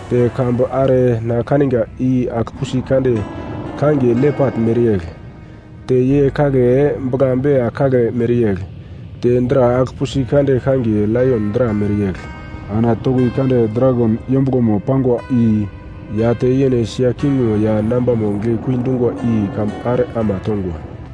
Te kambumo are na kaniga i agl-pusi kande kangiye lepat mereyegl, te ye kagle bugla-bea kagle mereyegl, te dra agl-pusi kande kangiye laion dra mereyegl, ana toki kande dragon yombuglomo pangwa i ya te yene sia kingmo ya nambamo giglekui dungwa i kambu are ama tongwa.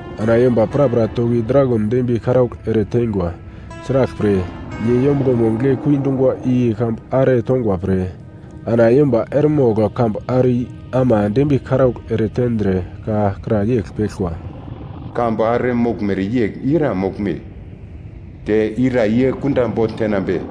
Ana yomba prapra toki dragon dembiye karaugl ere tengwa. Sraglpre, ye yombuglomo giglekui dungwa i kambu are tongwa pre, ana yomba eremogl kambu are i ama dembiye karaugl eretendre ka kra yegl peglkwa, “Kambu are moglmere yegl ira moglme? Te ira ye kunda bogl tenambe?”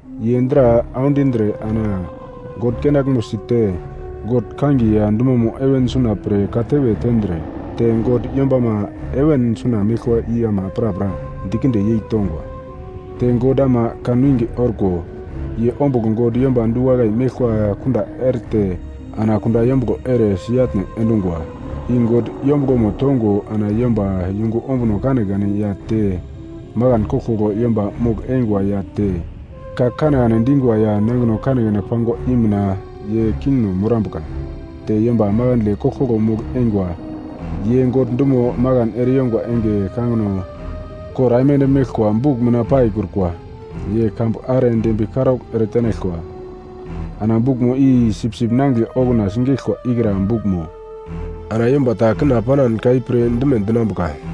Ye dra aundindre ana God kenaglmo si te God kangiye ya dumomo heven suna pre katewe tendre, te God yombama heven suna meglkwa i ama prapra dikinde yeitongwa. Te God ama kan winge orko ye ombugl God yomba du-wakai meglkwa kunda erete ana kunda yombuglo ere si-atne endungwa. I God yombuglomo tongo ana yomba yungu ombuno kanekane ya te makan koglkoglo yomba mogl-eingwa ya te ka kanekane dingwa ya nangino kanekane pangwa i mina ye kingno morambuka, te yomba makandle koglkoglo mogl-eingwa, ye God dumo makan ereyongwa enge kangino kor aimande meglkwa buk mina paikrukwa, ye kambu are dembiye karaugl ere tenaglkwa. Ana bukmo i Sipsip Nangigle okuna sigeglkwa ikra bukmo. Ana yomba ta kina panan ka i pirdime dinambuka: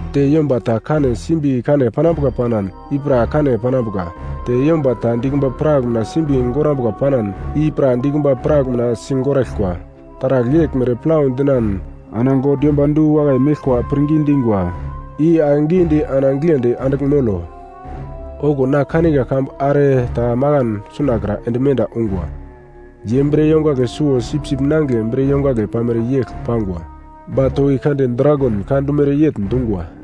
Te yomba ta kane simbi kane panambuka panan, i pra kane panambuka, te yomba ta dikumba prak mina simbi gorambuka panan, i pra dikumba prak mina sigoraglkwa. Taragl yeglmere plau dinan ana God yomba du-wakai meglkwa pirngi dingwa i ake gidi ana giglendi andigl molo. Okuwo na kaniga kambu are ta makan sunakra ende menda ungwa. Ye bre yongagle suwo sipsip nangigle bre yongagle pamere yegl pangwa ba toki kande dragon ka dumere yegl dungwa.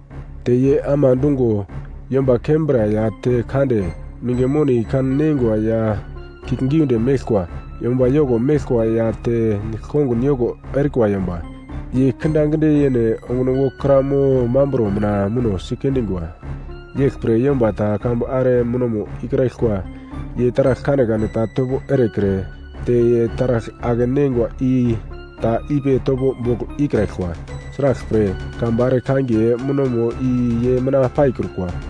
Te ye ama dungo yomba kembra ya te kande, minge moni kan neingwa ya kiuglgiunde meglkwa, yomba yoko meglkwa ya te nigl-kongun yoko erikwa yomba, ye kindaginde yene onguno wokra mo mamburo mina muno sikendingwa. Yeglpre yomba ta kambu are munomo ikraglkwa, ye taragl kanekane ta topo erekre, te ye taragl ake-neingwa i ta ipi topo bogl ikraglkwa. Sraglpre, kambu are kangiye munomo i ye mina paikrukwa.